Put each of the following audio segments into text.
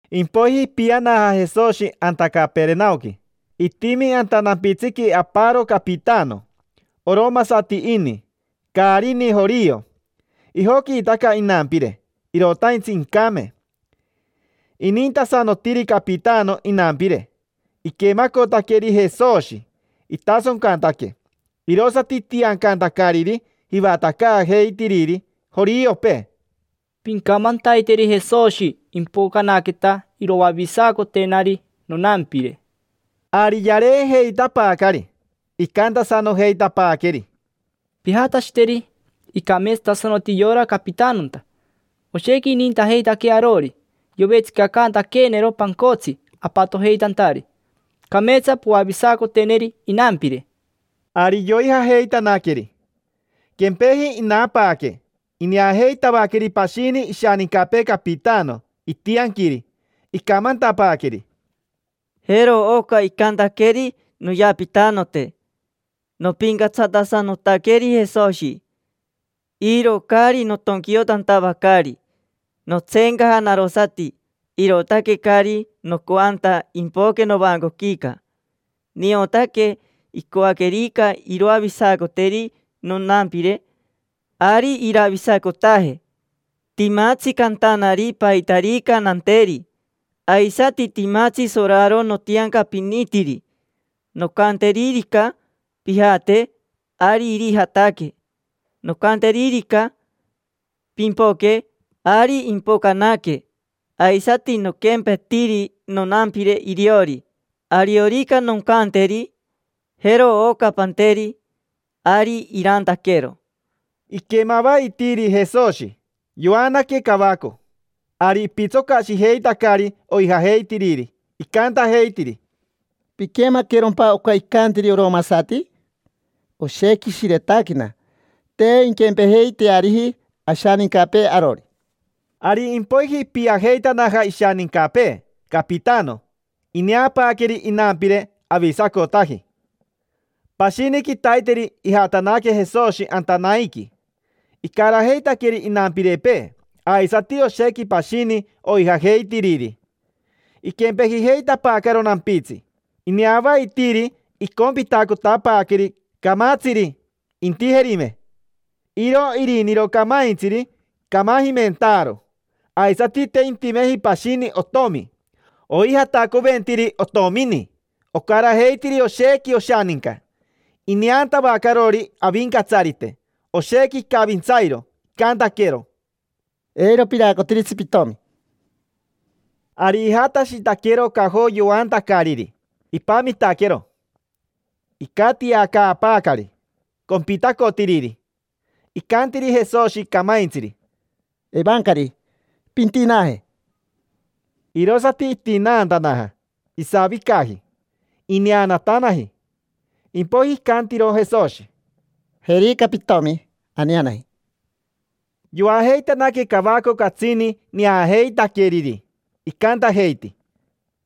Impoiji ipianaja Jesoshi anta Caperenaoqui. Itimi anta nampitsiqui aparo capitano. Oromasati ini, caari ini jorio. Ijoquiitaca inampire, irotaintsi incame. Inintasanotiri capitano inampire. Iquemacotaqueri Jesoshi, itasoncantaque, irosati itiancantacariri jivatacaajeitiriri joriopee: —Pincamantaiteri Jesoshi impocanaqueta iroavisacotenari nonampire. Ari yareejeitapaacari, icantasanojeitapaaqueri: —Pijatashiteri. Icameetsatasanoti yora capitanonta, oshequi inintajeitaquee arori. Yovetsicacantaqueenero pancotsi apatojeitantari. Cameetsa poavisacoteneri inampire. Ari yoijajeitanaqueri. Quempeji inapaaque, ineajeitavaqueri pashini ishanincapee capitano, itianquiri. Icamantapaaqueri: —Jero oca icantaqueri noyapitanote: “Nopincatsatasanotaqueri Jesoshi, iro caari notonquiotantavacari. Notseencaja narosati, irootaque caari nocoanta impoque novancoquica. Niotaque incoaquerica iroavisacoteri nonampire, ari iravisacotaje. Timatsi cantanari paitarica nanteri, aisati timatsi soraro notiancapinitiri. Noncanteririca: ‘Pijate’, ari irijataque. Noncanteririca: ‘Pimpoque’, ari impocanaque. Aisati noquempetiri nonampire iriori, ariorica noncanteri: ‘Jero oca panteri’, ari irantaquero”. Iquemavaitiiri Jesoshi, yoanaque cavaco. Ari ipitsocashijeitacari oijajeitiriri, icantajeitiri: —¿Piquemaquerompa oca icantiri oromasati? Oshequi ishiretaquena, te inquempejeiteariji ashanincapee arori. Ari impoiji ipiajeitanaja ishanincapee capitano. Ineapaaqueri inampire, avisacotaji. Pashini quitaiteri ijatanaque Jesoshi anta Naiqui, icarajeitaqueri inampirepee aisati oshequi pashini oijajeitiriri. Iquempejijeitapaacaro nampitsi, ineavaitiiri icompitacotapaaqueri camatsiri, intijerime. Iro iriniro camaintsiri camajimentaaro, aisati te intimeji pashini otomi. Oijatacoventiri otomini, ocarajeitiri oshequi oshaninca. Ineantavacarori Avincatsarite, oshequi icavintsairo, icantaquero: —Eiro piraacotiritsi pitomi. Ari ijatashitaquero cajo yoantacariri, ipamitaquero. Icatiacaapaacari compitacotiriri. Icantiri Jesoshi camaintsiri: —Evancari, pintinaaje. Irosati itinaantanaja, isavicaji; ineanatanaji. Impoiji icantiro Jesoshi: —Jerica pitomi, aneanaji. Yoajeitanaque cavaco catsini neajeitaqueriri, icantajeiti: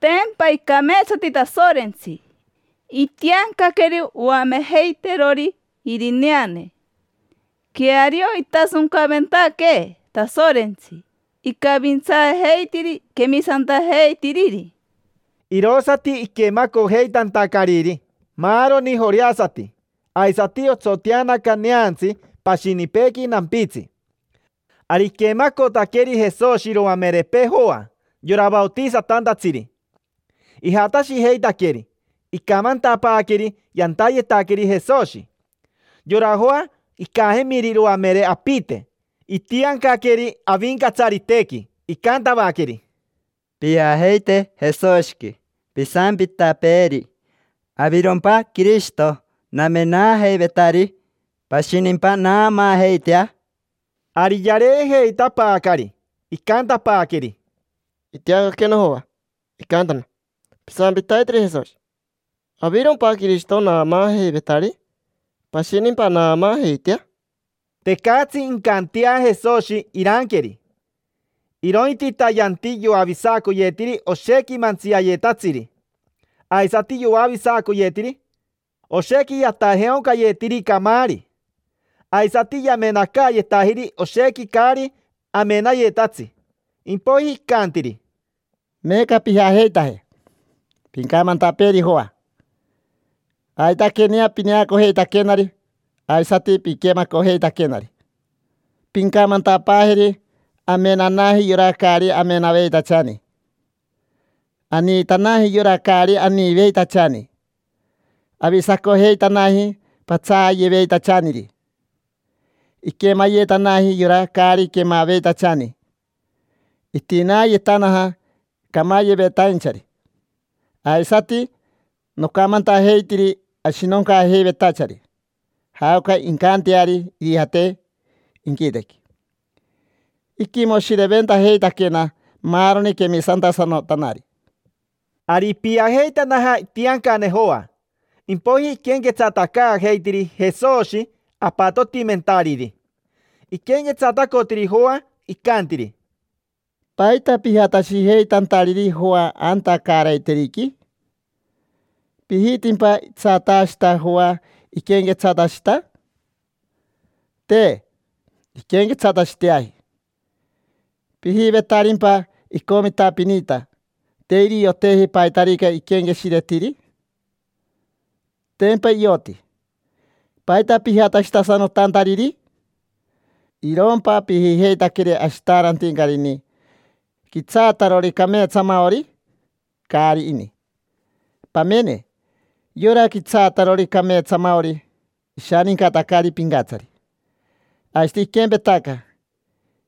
—Tempa icameetsati Tasorentsi. Itiancaqueeri oamejeiteerori irineane. Queario, itasoncaventaquee Tasorentsi, icavintsaajeitiri quemisantajeitiriri. Irosati iquemacojeitantacariri maaroni joreasati, aisati otsoteanaca neantsi pashinipeequi nampitsi. Ari iquemacotaqueri Jesoshi iroamerepee Joa, yora vaotisatantatsiri. Ijatashijeitaqueri, icamantapaaqueri yantayetaqueri Jesoshi. Yora Joa, icajemiri iroamere apite, itiancaqueri Avincatsaritequi, icantavaqueri: —Pijajeite Jesoshiqui, pisampitapeeri: “¿Avirompa Quirishito namenaajeivetari? ¿Pashinimpa naamaajeitea?” Ari yareejeitapaacari, icantapaaqueri: —Itiancaquena Joa, icantana: “Pisampitaiteri Jesoshi: ‘¿Avirompa Quirishito naamaajeivetari? ¿Pashinimpa naamaajeitea?’” Tecatsi incantea Jesoshi iranqueri, irointita yanti yoavisacoyetiri oshequi mantsiayetatsiri, aisati yoavisacoyetiri oshequi yatajeaoncayetiri camaari. Aisati yamenacaayetajiri oshequi caari amenayetatsi. Impoiji icantiri: —Meeca pijajeitaje, pincamantapeeri Joa aitaquenea pineacojeitaquenari aisati piquemacojeitaquenari. Pincamantapaajeri amenanaji yora caari amenaveitachani, aniitanaji yora caari aniiveitachani, avisacojeitanaji patsaayeveitachaniri, iquemayetanaji yora caari quemaveitachani, itinaayetanaja camayevetainchari. Aisati nocamantajeitiri ashinoncaajeivetachari jaoca incanteari irijate inquitequi. Iquimoshireventajeitaquena maaroni quemisantasanotanari. Ari ipiajeitanaja itiancane Joa, impoiji iquenquetsatacaajeitiri Jesoshi apatotimentariri. Iquenquetsatacotiri Joa, icantiri: —¿Paita pijatashijeitantariri Joa anta caaraiteriqui? ¿Pijitimpa itsataashita Joa, iquenquetsatashita? Te inquenquetsatashiteaji. ¿Pijivetarimpa icomitapinita, te irioteji paitarica iquenqueshiretiri? Tempa ioti. ¿Paita pijatashitasanotantariri? ¿Irompa pijijeitaqueri ashitaarantincari ini, quitsaatarori cameetsamaori? Caari ini. Pamene, yora quitsaatarori cameetsamaori ishanincatacari pincatsari, aisati iquempetaca: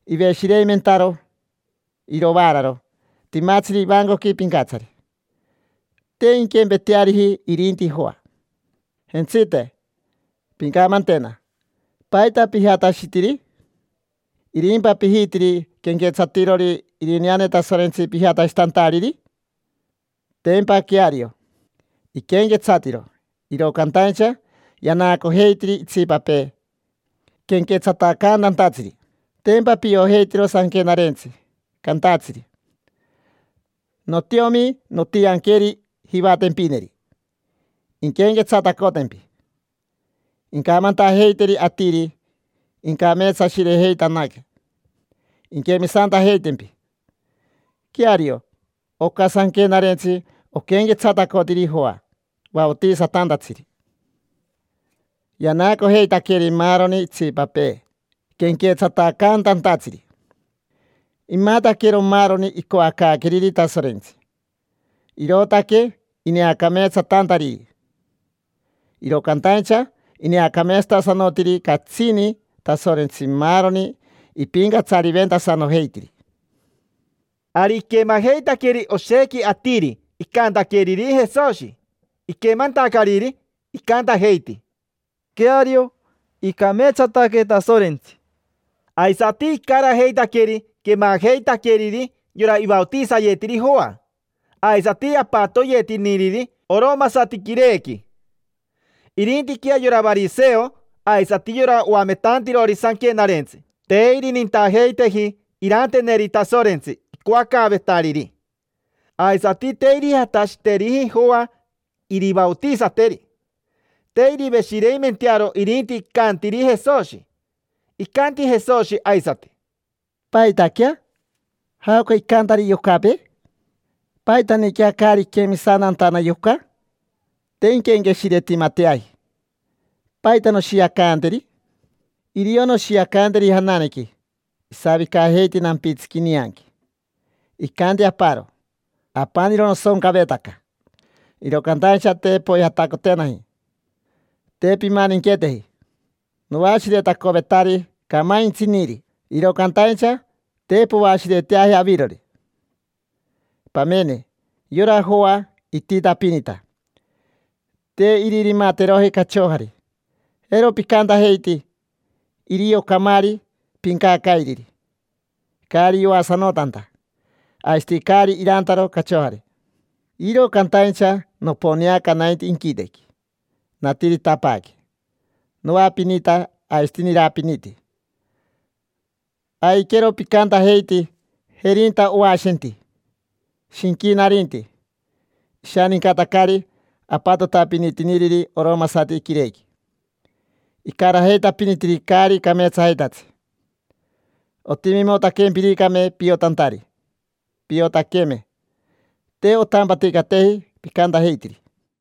iveshireimentaro irovaararo timatsiri ivancoqui pincatsari. Te inquempeteariji irinti Joa. Jentsite, pincamantena: ¿paita pijatashitiri? ¿Irimpa pijitiri quenquetsatirori irineane Tasorentsi pijatashitantariri? Tempa queario, iquenquetsatiro, iro cantaincha yanaacojeitiri itsipapee quenquetsatacantantatsiri. Tempa piojeitiro sanquenarentsi cantatsiri: “Notiomi, nontianqueri jivatempineri, inquenquetsatacotempi. Incamantajeiteri atiri incameetsashirejeitanaque, inquemisantajeitempi”. Queario, oca sanquenarentsi oquenquetsatacotiri Joa Vaotisatantatsiri. Yanaacojeitaqueri maaroni itsipapee quenquetsatacantantatsiri: imataquero maaroni icoacaaqueriri Tasorentsi, irootaque ineacameetsatantariri. Iro cantaincha ineacameetsatasanotiri catsini Tasorentsi maaroni ipincatsariventasanojeitiri. Ari iquemajeitaqueri oshequi atiri icantaqueriri Jesoshi. Iquemantacariri, icantajeiti: —Queario, icameetsataque Tasorentsi. Aisati icarajeitaqueri quemajeitaqueriri yora ivaotisayetiri Joa, aisati apatoyetiniriri oromasati quirequi. Irintiquea yora variseo aisati yora oametantirori sanquenarentsi te irinintajeiteji iranteneri Tasorentsi icoacaavetariri, aisati te irijatashiteriji Joa irivaotisateri. Te iriveshireimentearo irinti icantiri Jesoshi. Icanti Jesoshi aisati: —¿Paitaquea? ¿Jaoca icantari yocapee? ¿Paitaniquea caari iquemisantantana yoca? Te inquenqueshiretimateaji. ¿Paita noshiacanteri? Irio noshiacanteri jananequi, isavicajeiti nampitsiqui nianqui, icanti aparo: “Apaniro nosoncavetaca, iro cantaincha te poijatacotenaji, te pimaninqueteji. Noashiretacovetari camaintsiniri, iro cantaincha te poashireteaji avirori”. Pamene, yora Joa ititapinita, te iririmateroji cachojari, jero picantajeiti: “Irio camaari pincacairiri, caari yoasanotanta, aisati caari irantaro cachojari”. Iro cantaincha noponeaca nainti inquitequi, natiritapaaque: noapinita aisati nirapiniti. Aiquero picantajeiti: “Jerinta oashenti, shinquinarinti. Ishanincatacari apatotapinitiniriri oromasati quirequi, icarajeitapinitiri caari cameetsajeitatsi”. Ontimimotaquempiricame piotantari, piotaqueme te ontampaticateji picantajeitiri.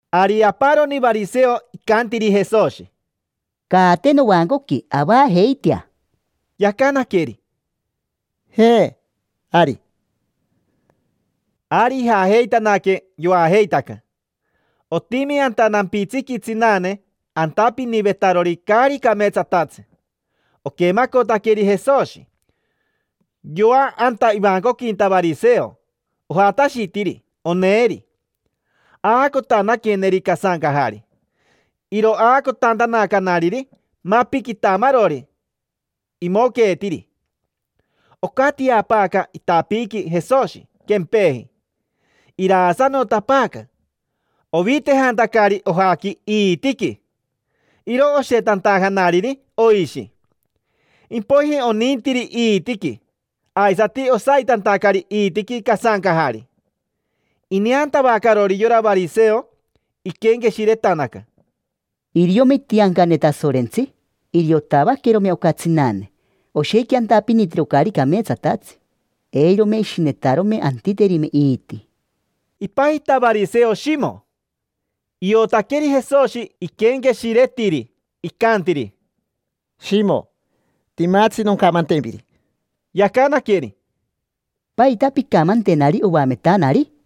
Ari aparoni variseo icantiri Jesoshi: —Caate novancoqui, avajeitea. Yacanaqueri: —Jaa, ari. Ari ijajeitanaque, yoajeitaca. Otimi anta nampitsiqui tsinane antapinivetarori caari cameetsatatsi. Oquemacotaqueri Jesoshi, yoa anta ivancoquinta variseo, ojatashitiri oneeri. Aacotanaqueneri casancajari. Iro aacotantanacanariri mapi quitamarori imoqueetiri. Ocatiapaaca itapiiqui Jesoshi, quempeji. Iraasanotapaaca, ovitejantacari ojaqui iitiqui, iro oshetantajanariri oishi. Impoiji onintiri iitiqui, aisati osaitantacari iitiqui casancajari. Ineantavacarori yora variseo, iquenqueshiretanaca: “Iriome itiancane Tasorentsi, iriotavaquerome oca tsinane. Oshequi antapinitiro caari cameetsatatsi, eirome ishinetarome antiterime iiti”. Ipajita variseo Shimo. Iotaqueri Jesoshi iquenqueshiretiri, icantiri: —Shimo, timatsi noncamantempiri. Yacanaqueri: —¿Paita pincamantenari oametanari?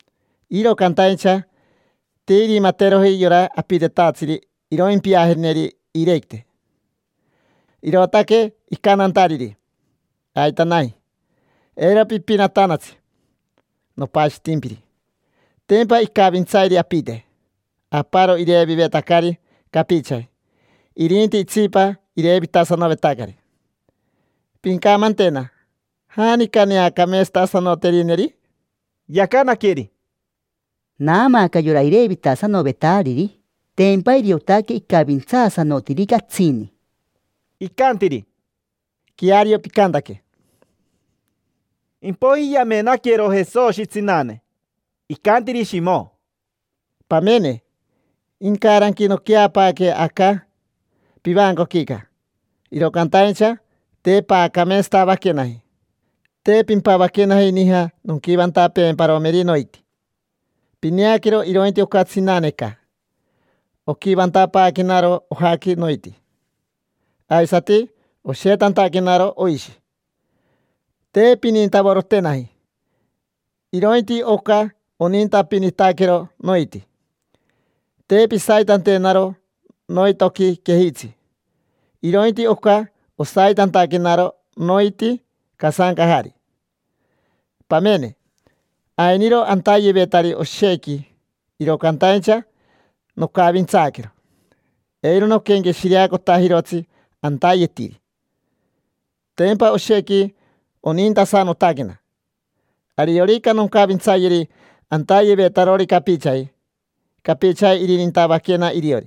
Iro cantaincha te irimateroji yora apitetatsiri iroimpiajeneri iirequite, irootaque icantantariri: “Aitanaji, eiro pipinatanatsi. Nopashitimpiri”. Tempa icavintsairi apite. Aparo irevivetacari capichaji, irinti itsipa irevitasanovetacari. Pincamantena: ¿janica neacameetsatasanoterineri? Yacanaqueri: —Naamaaca yora irevitasanovetariri, tempa iriotaque icavintsaasanotiri catsini. Icantiri: —Queario picantaque. Impoiji yamenaquero Jesoshi tsinane, icantiri Shimo: —Pamene, incaranqui noqueapaaque aca pivancoquica, iro cantaincha te paacameetsatavaquenaji: te pimpavaquenaji nija nonquivantapeemparomeri noiti. Pineaquero irointi oca tsinaneca. Oquivantapaaquenaro ojaqui noiti, aisati oshetantaquenaro oishi. Te pinintavorotenaji, irointi oca, onintapinitaquero noiti. Te pisaitantenaro noitoqui quejitsi, irointi oca, osaitantaquenaro noiti casancajari. Pamene, ainiro antayevetari oshequi, iro cantaincha nocavintsaaquero, eiro noquenqueshireacotajirotsi antayetiri: tempa oshequi onintasanotaquena. Ariorica noncavintsayeri antayevetarori capichaji, capichaji irinintavaquena iriori.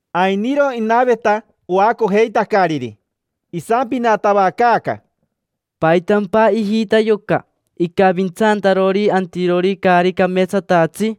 Ainiro inaveta oacojeitacariri, isampinatavacaaca: —¿Paitampa ijita yoca, icavintsantarori antirori caari cameetsatatsi?